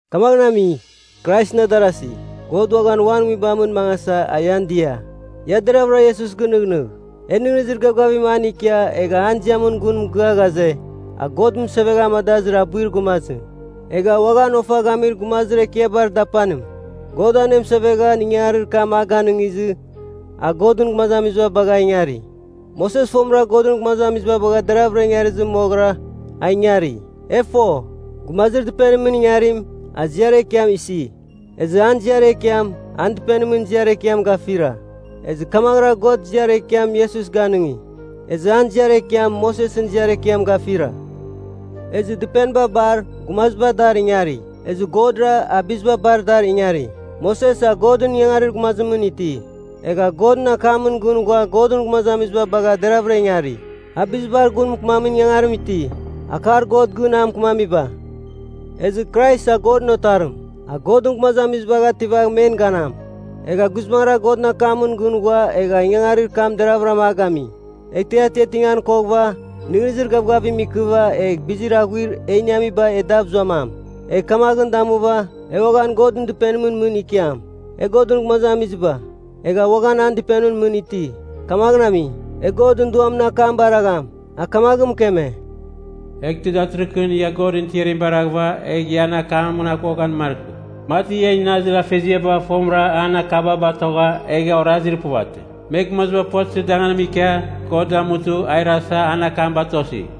Kamaghɨn ami, Kraisɨn adarasi, God uaghan Uan Nguibamɨn mangasa, a ian dia. Ia deravɨra Iesus gɨnɨghnɨgh, e nɨghnɨzir gavgavim an ikia, egha an ziamɨn gun mɨgɨa ghaze, a God mɨsevegha amadazir abuir gumazim, egha uaghan Ofa Gamir Gumazir Ekiabar Dapanim. God anemɨsevegha ingangarir kam a ganɨngizɨ, a Godɨn gumazamiziba bagha ingari. Moses fomɨra Godɨn gumazamiziba bagha deravɨra ingarizɨ moghɨra, a ingari. E fo, gumazir dɨpenimɨn ingarim, a ziar ekiam isi, ezɨ an ziar ekiam, an dɨpenimɨn ziar ekiam gafira. Ezɨ kamaghɨra God ziar ekiam Iesus ganɨngi, ezɨ an ziar ekiam, Mosesɨn ziar ekiam gafira. Ezɨ dɨpeniba bar, gumaziba dar ingari. Ezɨ Godra, a biziba bar dar ingari. Moses a Godɨn ingangarir gumazimɨn iti, egha Godɨn akamɨn gɨn ghua Godɨn gumazamiziba bagha deravɨra ingari. A bizibar gun mɨkɨmamin ingangarim iti, akar God gɨn a mɨkɨmamiba. Ezɨ Krais a Godɨn Otarim, a Godɨn gumazamizibagh ativagh men ganam. Egha guizbangɨra Godɨn akamɨn gɨn ghua egha ingangarir kam deravɨra a gami. Eghtɨ e atiatingan koghɨva, nɨghnɨzir gavgavim ikɨva egh bizir aghuir e iniamiba e dav zuamam, egh kamaghɨn damuva, e uaghan Godɨn Dɨpenimɨn mɨn ikiam. E Godɨn gumazamiziba, egha uaghan an dɨpenimɨn mɨn iti, kamaghɨn ami, e Godɨn Duamɨn akam baragham. A kamaghɨn mɨkeme, “Eghtɨ datɨrɨghɨn ia Godɨn tiarim baraghɨva, egh ia an akamɨn aghuaghan markɨ, mati ian inazir afeziaba fomɨra an akaba batogha egha orazir puvatɨ. Me gumaziba puvatɨzir danganimɨn ikia God damutɨ a irasa an akam batosi.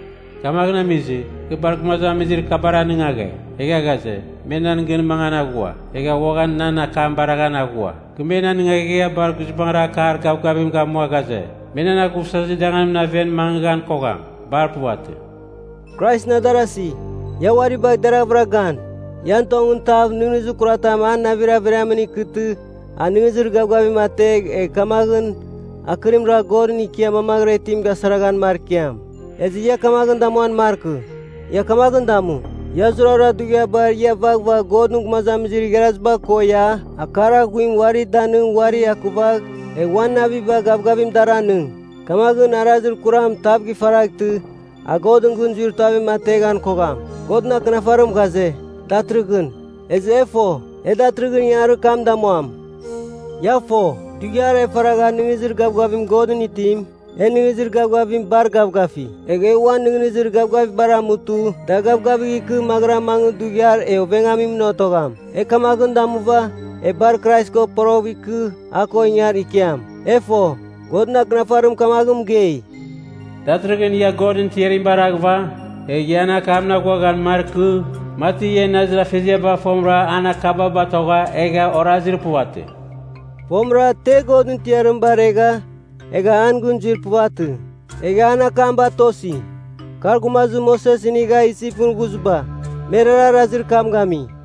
Kamaghɨn amizɨ, kɨ bar gumazamizir kabar anɨngaghe, egha ghaze, ‘Me nan gɨn mangan aghua, egha uaghan nan akam baraghan aghua.’ Kɨ men anɨngaghegha bar guizbangɨra akar gavgavim gamua ghaze, ‘Me nan aghuvsazir danganimɨn aven mangɨghan kogham. Bar puvatɨ!’” Kraisɨn adarasi, ia uari bagh deravɨra gan, ian tongɨn tav nɨghnɨzir kuratam a navir averiamɨn ikɨtɨ a nɨghnɨzir gavgavim ategh, egh kamaghɨn akɨrim ragh Godɨn ikia mamaghɨra itim gasaraghan markiam. Ezɨ ia kamaghɨn damuan markɨ, ia kamaghɨn damu, ia zurara dughiabar ia vaghvagh Godɨn gumazamizir igharaziba ko ia, akar aghuim uari danɨng uarir akurvagh egh uan naviba gavgavim dar anɨng. Kamaghɨn arazir kuram tav gifaraghtɨ, a Godɨn gɨn zuir tuavim ateghan kogham. Godɨn Akɨnafarim ghaze, “Datɨrɨghɨn,” ezɨ e fo, e datɨrɨghɨn ingangarir kam damuam. Ia fo, dughiar e faragha nɨghnɨzir gavgavim Godɨn itim, en nɨghnɨzir gavgavim bar gavgafi. Egh e uan nɨghnɨzir gavgavibar amutɨ da gavgavigh ikɨ maghɨra mangɨ dughiar e ovengamimɨn otogham. E kamaghɨn damuva, e bar Krais ko poroghɨv ikɨ a ko ingar ikiam. E fo, Godɨn Akɨnafarim kamaghɨn mɨgei, “Datɨrɨghɨn ia Godɨn tiarim baraghɨva, egh ia an akamɨn aghuaghan markɨ, mati ian inazir afeziaba fomɨra an akaba batogha egha orazir puvatɨ.” Fomɨra te Godɨn tiarim baregha, egha an gɨn zuir puvatɨ, egha an akam batosi? Kar gumazamizir Moses inigha Isipɨn ghuziba. Merara arazir kam gami.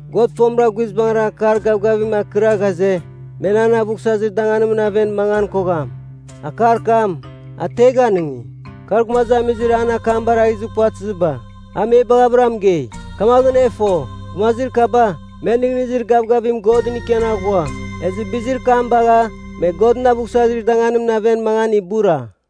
God fomɨra guizbangɨra akar gavgavim akɨra ghaze, “Me nan aghuvsazir danganimɨn aven mangan kogham.” Akar kam, a te ganɨngi? Kar gumazamizir an akam barazir puvatɨziba. A me baghɨvɨra mɨgei. Kamaghɨn e fo, gumazir kaba me nɨghnɨzir gavgavim Godɨn ikian aghua. Ezɨ bizir kam bagha me Godɨn aghuvsazir danganimɨn aven mangan ibura.